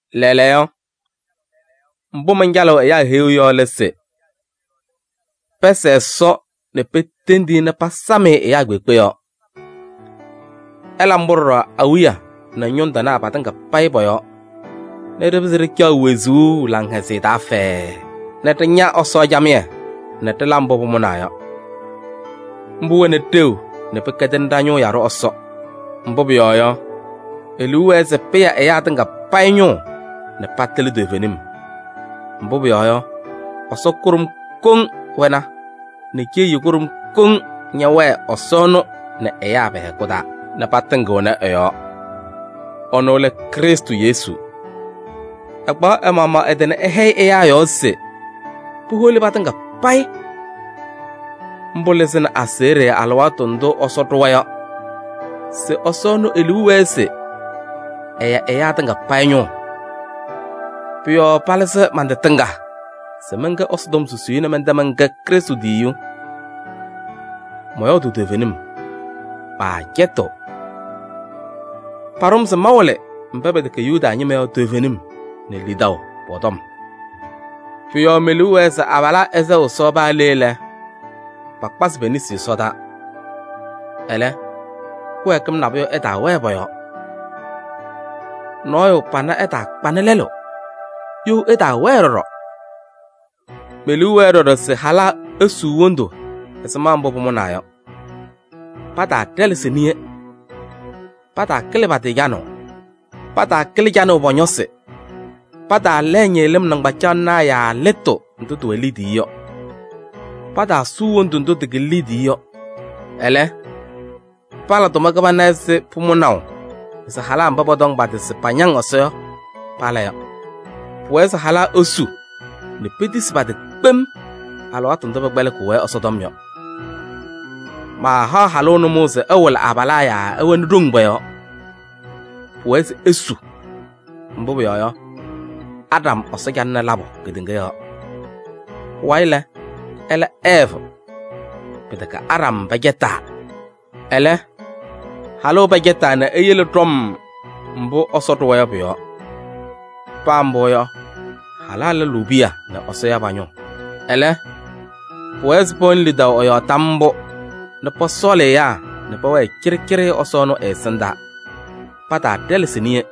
Lɛɛlɛɛyɔ, mbʋ mancalɩɣ ɛyaa heyuu yɔ lɛ se: pɛsɛɛ Ɛsɔ nɛ petendi-i nɛ pasam-ɩ ɛyaa kpeekpe yɔɔ. Ɩla mbʋ ɖɔɖɔ awiya nɛ ñʋŋ tɩnaa patɩŋa payɩ pɔ-yɔɔ nɛ ɖɩpɩzɩ ɖɩcaɣ wezuu laŋhɛzɩyɛ taa fɛɛɛ nɛ ɖɩña Ɛsɔ camɩyɛ nɛ ɖɩla mbʋ pʋmʋnaa yɔ. Mbʋ wɛnɩ ɖeu nɛ pɩkɛdɩnɩ ɖa-ñʋʋ yaɖʋ Ɛsɔ Mbʋ pʋyɔɔ yɔ, e-liu wɛɛ se pɩya ɛyaa tɩŋa payɩ ñʋʋ nɛ patɩlɩ toovenim. Mbʋ pʋyɔɔ yɔ, Ɛsɔ kʋɖʋm koŋ wɛna nɛ ceyiyu kʋɖʋm koŋ ñɛwɛɛ Ɛsɔ ɛnʋ nɛ ɛyaa pɛ-hɛkʋ taa nɛ patɩŋɩɣnɩ ɛ-yɔɔ. Ɛnʋ lɛ Krɩstʋ Yesu. Ɛkpaɣ ɛ-maɣmaɣ ɛ-tɩ nɛ ɛhɛyɩ ɛyaa yɔɔ se puholi patɩŋa payɩ: mbʋ lɩzɩnɩ aseɣɖe alɩwaatʋ ndʋ Ɛsɔ ɖʋwa yɔ se Ɛsɔ ɛnʋ e-liu wɛɛ se ɛya ɛyaa tɩŋa payɩ ñʋʋ. Pʋ-yɔɔ palɩzɩ man-tɩ tɩŋa se mɛnkɛ Ɛsɔtɔm susiyu nɛ mɛntɛ mɛnkɛ Krɩstʋ tiyiyu. Mɔyɔɔdʋʋ toovenim, maacɛtɩɣ. Paɖʋ-m se mawɩlɩ mba pɛtɛkɛ Yuda ñɩma yɔ toovenim nɛ lidaʋ pɔ-tɔm. Pʋ-yɔɔ me-liu wɛɛ se abalaa ɛsɛɣ Ɛsɔ paa le lɛ, pakpazɩ pe-nesi ɛsɔdaa. Ɛlɛ kɩwɛɛkɩm nabʋyʋ ɛtaawɛɛ pɔ-yɔɔ. Nɔɔyʋ pana ɛtaakpanɩ lɛlʋ, you ɛtaawɛɛ ɖɔɖɔ. Me-liu wɛɛ ɖɔɖɔ se halaa esuu wondu ɛzɩma mbʋ pʋmʋnaa yɔ, pataaɖɛlɛsɩ niye, pataakɩlɩ pa-tɩ canʋʋ. Pataakɩlɩ canʋʋ pɔ-ñɔsɩ, pataalɛɛ ñɩɣlɩm nɩŋgbacaɣlɩnaa yaa lɩtʋ ndʋ tɩwɛ liidiye yɔ, pataasuu wondu ndʋ tɩkɩlɩ liidiye yɔ. Ɛlɛ, pala tʋma kɩbana ɛzɩ pʋmʋnaʋ se halaa mba pɔtɔŋ pa-tɩ se pañaŋ Ɛsɔ yɔ pala yɔ. Pʋwɛɛ se halaa esu nɛ petisi pa-tɩ kpem alɩwaatʋ ndʋ pɛkpɛlɩkɩɣ-wɛ Ɛsɔtɔm yɔ. Maahaɣ halʋ nʋmɔʋ se ɛwɩlɩ abalaa yaa ɛwɛnɩ ɖoŋ pɔ-yɔɔ. Pʋwɛɛ se esu. Mbʋ pʋyɔɔ yɔ, Aɖam Ɛsɔ calɩnɩ labʋ kedeŋa yɔɔ. Pʋwayɩ lɛ, ɛla Ɛɛvɩ. Pɩtɛkɛ Aɖam pɛcɛtaa, ɛlɛ, halʋ pɛcɛtaa nɛ eyele ɖɔm mbʋ Ɛsɔ ɖʋwa yɔ pʋ-yɔɔ. Paa mbʋ yɔ, halaa lʋlʋʋ piya nɛ Ɛsɔ ya pa-ñʋʋ. Ɛlɛ, pʋwɛɛ se pɛwɛnɩ lidaʋ ɛ-yɔɔ tam mbʋ nɛ pɔsɔɔlɩ ɛyaa nɛ pɛwɛɛ cɩɖɩcɩɖɩ Ɛsɔ ɛnʋ ɛ-ɛsɩndaa. Pataaɖɛlɛsɩ niye.